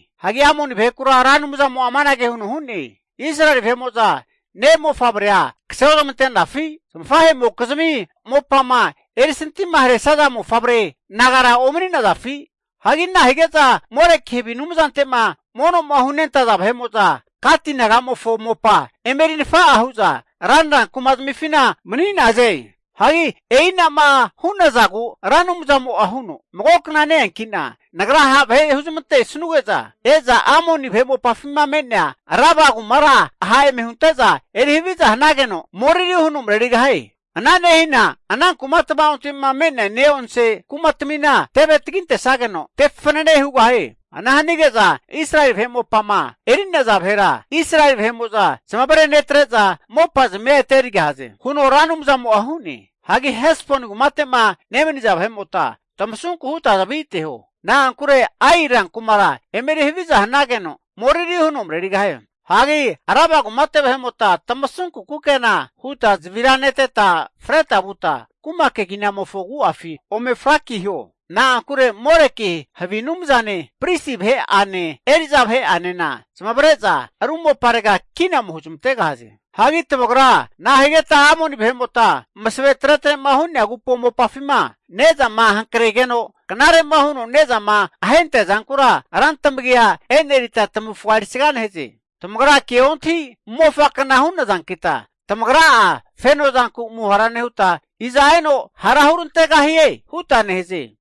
Hagi Amoni vahekura Ra Anumzamo'a amanage huno hu'ne, Israeli vahe'mo'za ne' mofavrea kase ozmante'nafi? Zamafahe'mokizmi mopama erisantima haresaza mofavre nagara omani'nazafi? Hagi nahige'za Moleki havi anumzante'ma mono'ma hunentaza vahe'mo'za, Gati naga'mofo mopa eme eri nafa'a hu'za ranra kuma zamifina mani'naze? Hagi e'ina'ma hu'nazagu Ra Anumzamo'a huno, Mago kna ne-eanki'na Nagra ha' vahe huzmante'sanuge'za e'za Amoni vahe mopafima me'nea Raba kumara ha' eme hunte'za eri haviza hanageno moriri huno marerigahie. Ana nehina ana kuma tva'onte'ma me'nea ne'onse kumatamina teve tagintesageno tefanane hugahie. Ana hanige'za Israeli vahe mopama eri'naza vahera Israeli vahe'mo'za zamavare netre'za mopa'zamia ete erigahaze, huno Ra Anumzamo'a hu'ne. Hagi Hesboni kumate'ma nemaniza vahe'mota tamasunku huta zavi ateho, na'ankure Ai rankumara eme eri haviza hanageno moriri huno marerigahie. Hagi Raba kumate vahe'mota tamasunku kukena huta zavira neteta freta vuta kuma keginamofo agu'afi ome frakiho. Na'ankure Moleki havi anumzane, pristi vahe'ane eri'za vahe'anena zamavare'za ru moparega kina ome huzamantegahaze. Hagi tamagra nahigeta Amoni vahe'mota masavenke huno tretre'ma hu'nea agupo mopafima ne'zama hankregeno knare'ma huno ne'zama ahentea zankura rantamagia enerita tamavufga erisga nehaze. Tamagra ke ontahi mofakna hu'nazankita, tamagra'a feno zanku muhara nehuta, iza eno hara eme hurantegahie? huta nehaze.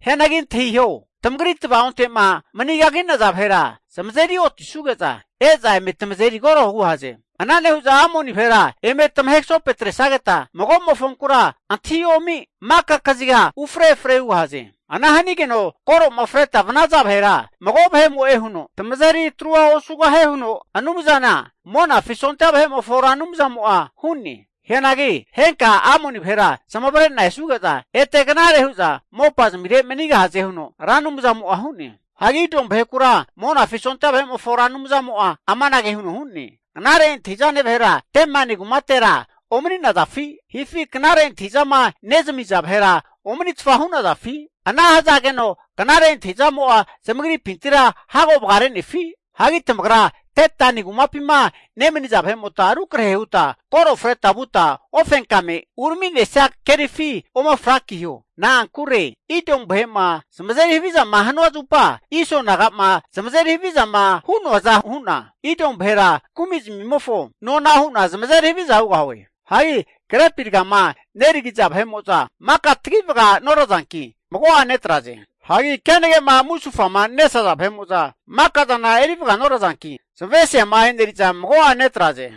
Hianagi antahiho, tamagri tvaonte'ma mani kagi'naza vahera zamazeri otisuge'za e'za eme tamazeri koro hugahaze. Ana nehu'za Amoni vahera eme tamahe kasopetresageta mago'mofonkura antahi omi maka kaziga ufre efre hugahaze. Ana hanage'za koro'ma freta vanaza vahera mago vahe'mo'e huno tamazeri atrua osugahie huno Anumzana Monafi sondia vahe'mofo Ra Anumzamo'a hu'ne. Hianagi henka Amoni vahera zamavare'na esuge'za ete knare hu'za mopazmire manigahaze huno Ra Anumzamo'a hu'ne. Hagi Idomu vahekura Monafi sondia vahe'mofo Ra Anumzamo'a amanage huno hu'ne, Knare antahi'zane vahera Temani kumatera omani'nazafi? Hifi knare antahi'zama nezamiza vahera omanitfa hu'nazafi? Ana hazageno knare antahizamo'a zamagripintira hago vagare'nefi? Hagi tamagra Dedani kumapima nemaniza vahe'mota rukrahe huta koro freta vuta ofenkame urami'nesia kerifi ome frakiho. Na'ankure Idomu vahe'ma zamazeri havizama hanua zupa Iso naga'ma zamazeri havizama hu'noaza hu'na Idomu vahera kumi zamimofo nona hu'na zamazeri haviza hugahue. Hagi grepi rgama neragiza vahe'mo'za maka tagi vaga norazanki mago'a netraze. Hagi kenage'ma musufama nesaza vahe'mo'za maka zana eri vaganorazanki, zamavesiama'a e'neriza mago'a netraze.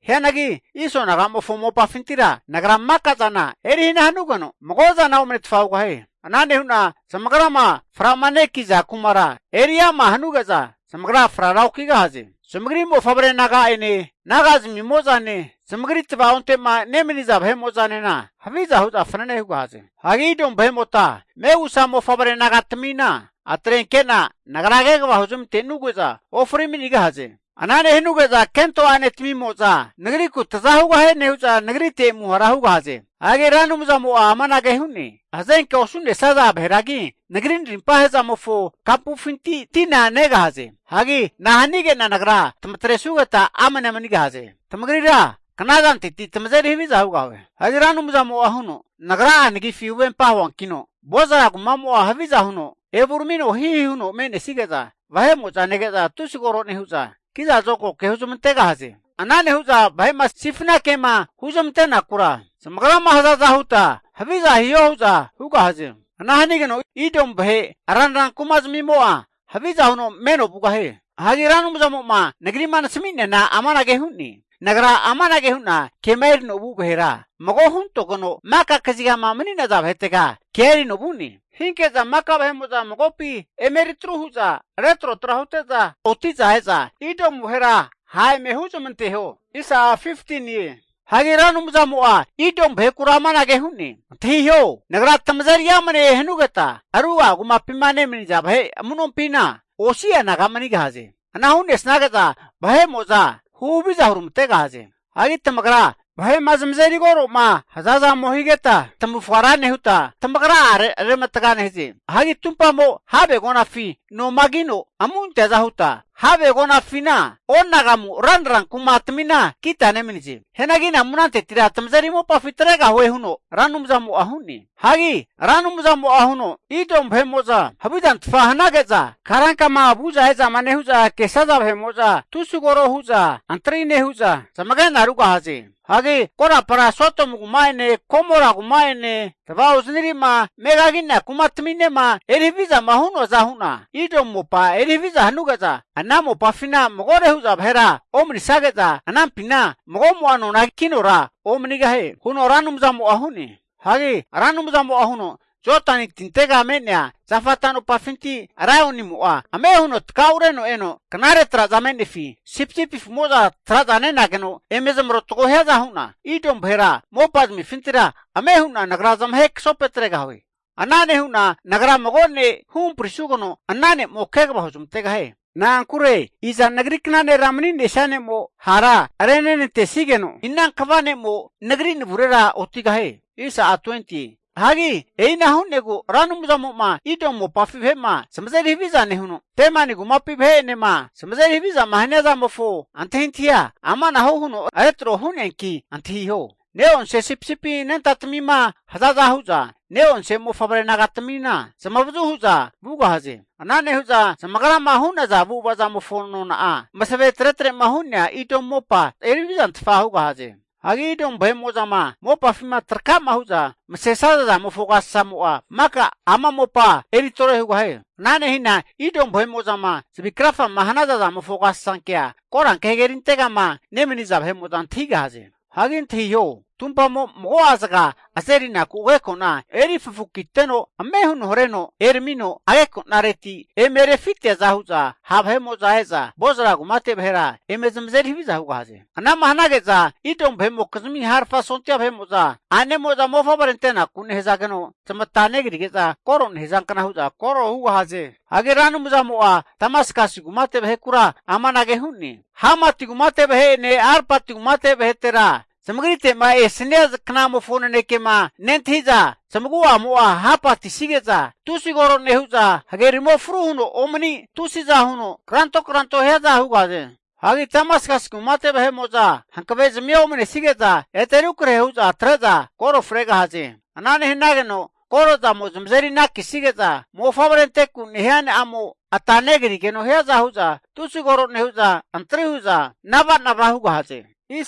Hianagi Iso naga'mofo mopafintira Nagra maka zana eri hana hanugeno mago zana omanetfa hugahie. Ana nehu'na zamagrama fra'manekiza kumara eri ama hanuge'za zamagra frara okigahaze. Zamagri mofavre naga'ene naga'zamimozane zamagri tvaonte'ma nemaniza vahemo'zanena haviza hu'za fanane hugahaze. Hagi Idomu vahe'mota megusa mofavre naga'tamina atrenke'na Nagra kegava huzmante'nuge'za ofri manigahaze. Ana nehanuge'za kento ane'tamimo'za Nagriku taza hugahie nehu'za muhara hugahaze. Hagi Ra Anumzamo'a amanage hu'ne, Hazenkea osu'nesaza vaheragi Nagri narimpa he'zamofo kapufinti tina negahaze. Hagi nahanige'na Nagra tamatresugeta amnea manigahaze? Tamagrira knazanteti tamazeri haviza hugahue. Hagi Ra Anumzamo'a huno, Nagra'a nagifi huvempa huankino Bozra kumamo'a haviza huno evuramino hihi huno me'nesige'za vahe'mo'za nege'za tusi koro nehu'za, kiza zokagoke huzamantegahaze. Ana nehu'za vahe'ma sifna kema huzamantenakura zamagrama hazaza huta haviza hiho hu'za hugahaze. Ana hanigeno Idomu vahe ranra kuma zamimo'a haviza huno meno vugahie. Hagi Ra Anumzamo'ma nagri'ma nasami'neana amanage hu'ne. Nagra amanage hu'na kema erino vu vahera mago huntogeno maka kazigama mani'naza vahetega kea erino vu'ne. Hinke'za maka vahe'mo'za magopi eme eritru hu'za retrotra hute'za oti'za e'za Idomu vahera ha' eme huzamanteho. Hagi Ra Anumzamo'a Idomu vahekura amanage hu'ne, Antahiho, Nagra tamazeri amane hanugeta ruga'a kumapima nemaniza vahe amu'nompina osi'a naga manigahaze. Ana hu'nesage'za vahe'mo'za huhaviza huramantegahaze. Hagi tamagra vahe'ma zamazeri koro'ma haza zamo higeta tamavufga ra nehuta tamagra'a reramatga nehaze. Hagi tumpamo have agonafi nomagino amu anteaza huta, have agonafina onagamu ranra kuma tamina kita nemanize. Hianagi anamu anantetira tamazeri mopafi atregahue, huno Ra Anumzamo'a hu'ne. Hagi Ra Anumzamo'a huno, Idomu vahe'mo'za havizantfa hanage'za, karankama vu'za e'zama nehu'za kesaza vahe'mo'za tusi koro hu'za antri nehu'za, zamagena rugahaze. Hagi korapara Sodomu kuma'ene Gomora kuma'ene tvaozanire'ma megagi'nea kumataminema eri havizama hu'noaza hu'na, Idomu mopa eri haviza hanuge'za ana mopafina magore hu'za vahera omanisage'za, anampina magomo'a nona kinora omanigahie huno Ra Anumzamo'a hu'ne. Hagi Ra Anumzamo'a huno, Jodani tintega me'nea zafa tanopafinti laionimo'a ame huno takaureno eno, knare traza me'nefi sipisipi afu'moza traza nenageno eme zamarotago hiaza hu'na, Idomu vahera mopa zamifintira ame hu'na Nagra zamahe kasopetregahue. Ana nehu'na Nagra mago ne' huhamprisugeno ana ne'mo kegava huzamantegahie. Na'ankure iza Nagri kna nera mani'nesia ne'mo hara renenantesigeno, ina kva ne'mo Nagri navurera otigahie? Hagi e'ina hu'negu Ra Anumzamo'ma Idomu mopafi vahe'ma zamazeri haviza nehuno, Temani kumapi vahe'enema zamazeri havizama hania zamofo antahintahia amanahu huno retro hu'neanki antahiho. Ne'onse sipisipi anentatamima hazaza hu'za, ne'onse mofavre nagatamina zamavazu hu'za vugahaze. Ana nehu'za zamagrama hu'naza avu'ava zamofo nona'a, masavenke huno tretre'ma hu'nea Idomu mopa eri havizantfa hugahaze. Hagi Idomu vahe'mo'zama mopafima trakama hu'za masesaza zamofo agasasamo'a maka ama mopa eri tore hugahie. Ana nehina Idomu vahe'mo'zama zavi krafama hanaza zamofo agasasankea Koranke Hagerintegama nemaniza vahe'mo'za antahigahaze. Hagi antahiho, tumpamo mago'a zaga azerinaku ageko'na eri fafukiteno ame huno hareno eramino ageko'nareti eme rufiteaza hu'za, ha' vahe'mo'za e'za Bozra kumate vahera eme zamazeri haviza hugahaze. Ana'ma hanage'za Idomu vahe'mokizmi harafa sondia vahe'mo'za a'nemo'za mofavre antenaku nehazageno zamata negrige'za koro nehazankna hu'za koro hugahaze. Hagi Ra Anumzamo'a Damaskasi kumate vahekura amanage hu'ne, Hamati kumate vahe'ene Arpati kumate vahetera, zamagrite'ma esania knamofo nanekema nentahi'za zamagu'amo'a hapanetisige'za tusi koro nehu'za, hagerimo fruhuno omani tusiza huno kranto kranto hiaza hugahaze. Hagi Damaskasi kumate vahe'mo'za hankavezamia omanesige'za ete rukrahe hu'za atre'za koro fregahaze. Ana nehanageno koro zamo zamazeri ananekisige'za, mofavre anteku nehia a'mo ata negrigeno hiaza hu'za tusi koro nehu'za, antri huza nava'nava hugahaze.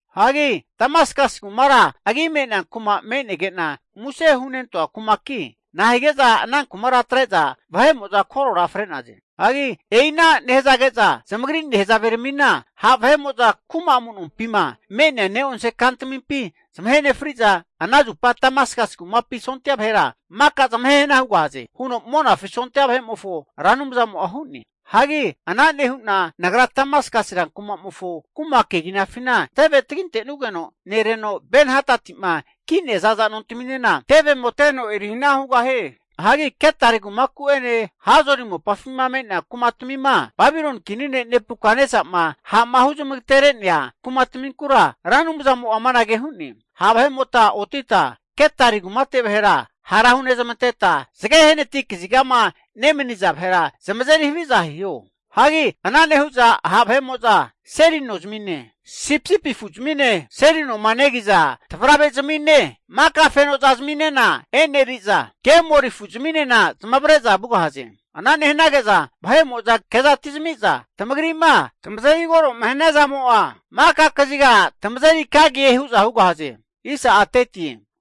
Hagi Damaskasi kumara agi me'nea kuma me'nege'na muse hunentoa kumaki, nahige'za ana kumara atre'za vahe'mo'za korora fre'naze? Hagi e'ina nehazage'za zamagri nehazaveramina ha' vahe'mo'za kuma amu'nompima me'nea neonse kantamimpi zamahe nefri'za, ana zupa Damaskasi kumapi sondia vahera maka zamahe hana hugahaze, huno Monafi sondia vahe'mofo Ra Anumzamo'a hu'ne. Hagi ana nehu'na Nagra Damaskasi rankumamofo kuma keginafina teve tagintenugeno nereno Ben-hadati'ma ki'nea zaza nontaminena tevemo teno eri hana hugahie. Hagi Kedari kumaku'ene Hazori mopafima me'nea kumatamima, Babiloni kini ne' Nebukatnesama ha'ma huzmagatere'nea kumataminkura Ra Anumzamo'a amanage hu'ne. Ha' vahe'mota otita Kedari kumate vahera hara hunezamanteta, zage hanati kazigama nemaniza vahera zamazeri haviza hiho. Hagi ana nehu'za ha' vahe'mo'za seli nozamine, sipisipi afu'zamine, seli noma negiza tavarave zamine maka fenoza zaminena e'neriza, kemori afu'zminena zamavare'za vugahaze. Ana nehanage'za vahe'mo'za kezatizami'za, tamagri'ma tamazeri koro'ma hania zamo'a maka kaziga tamazeri kagie hu'za hugahaze.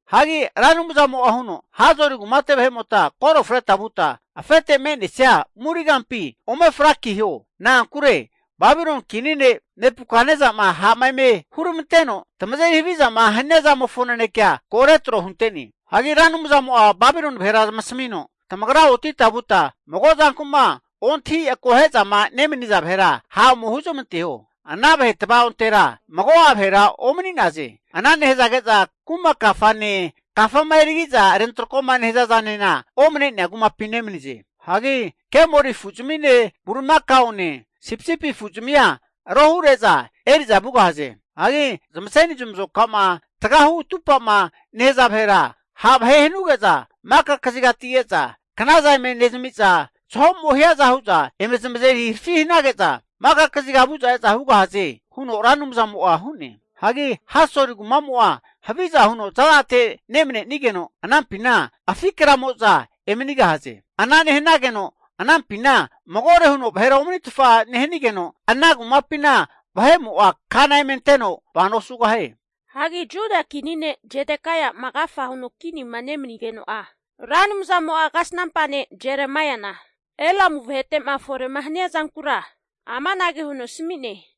Hagi Ra Anumzamo'a huno, Hazori kumate vahe'mota koro freta vuta afete me'nesia muri kampi ome frakiho. Na'ankure Babiloni kini ne' Nebukatnesama ha'ma eme huramanteno tamazeri havizama hania zamofo nanekea ko retro hunte'ne. Hagi Ra Anumzamo'a Babiloni vahera zamasamino, Tamagra otita vuta mago zanku'ma ontahi akohe'zama nemaniza vahera ha' ome huzamanteho. Ana vahe tva'ontera mago'a vahera omani'naze, ana nehazage'za, kuma kafane kafama erigi'za rentrako'ma nehaza zanena omane'nea kumapi nemanize. Hagi kemoli afu'zamine bulimakaone sipisipi afu'zamia rohure'za eri'za vugahaze. Hagi zamaseni zamazoka'ma tagahu atupa'ma nehaza vahera, ha' vahe hanuge'za maka kazigati e'za knazana eme nezami'za, zaho'mo hiaza hu'za eme zamazeri harafi hanage'za maka kaziga vu'za e'za hugahaze, huno Ra Anumzamo'a hu'ne. Hagi Hasori kumamo'a haviza huno za'zate nemanenigeno, anampina afi kraramimo'za emanigahaze. Ana nehanigeno anampina magore huno vahera omanitfa nehanigeno, ana kumapina vahe'mo'a kana eme anteno vano osugahie. Hagi Juda kini ne' Zedekaia'ma agafa huno kinima nemanigeno'a, Ra Anumzamo'a kasnampa ne' Jeremaiana Elamu vahete'ma fore'ma hania zankura amanage huno asami'ne.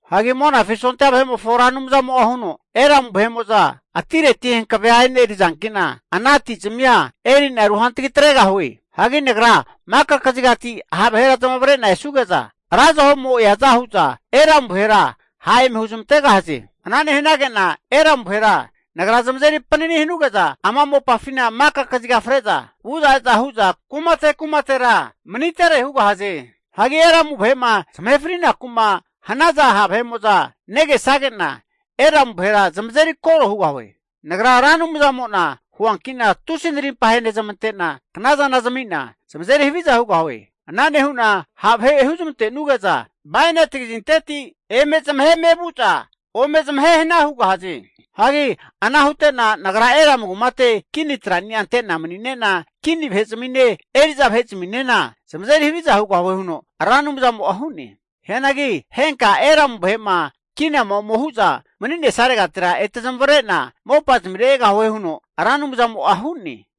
Hagi Monafi sondia vahe'mofo Ra Anumzamo'a huno, Elamu vahe'mo'za atireti hankavea e'nerizanki'na ana ati zamia eri'na rehantagi atregahue. Hagi Nagra maka kazigati ha' vahera zamavare'na esanuge'za, ra zaho'mo eaza hu'za Elamu vahera ha' eme huzmantegahaze. Ana hanage'na Elamu vahera Nagra zamazeri panani hanuge'za ama mopafina maka kaziga fre'za vu'za e'za hu'za kumate kumatera manitere hugahaze. Hagi Elamu vahe'ma zamahe frinaku'ma hanaza ha' vahe'mo'za negesage'na, Elamu vahera zamazeri koro hugahue. Nagra Ra Anumzamo'na huanki'na tusi narimpa ahenezmante'na knazana zami'na zamazeri haviza hugahue. Ana nehu'na ha' vahe huzamante'nuge'za bainati kazinteti eme zamaheme vu'za ome zamahe hana hugahaze. Hagi ana hute'na Nagra Elamu kumate kini trani'a ante'na manine'na, kini vahe'zamine eri'za vahe'zaminena zamazeri haviza hugahue, huno Ra Anumzamo'a hu'ne. Hianagi henka Elamu vahe'ma kinama ome hu'za mani'nesaregatira, ete zamavare'na mopazamire egahue, huno Ra Anumzamo'a hu'ne.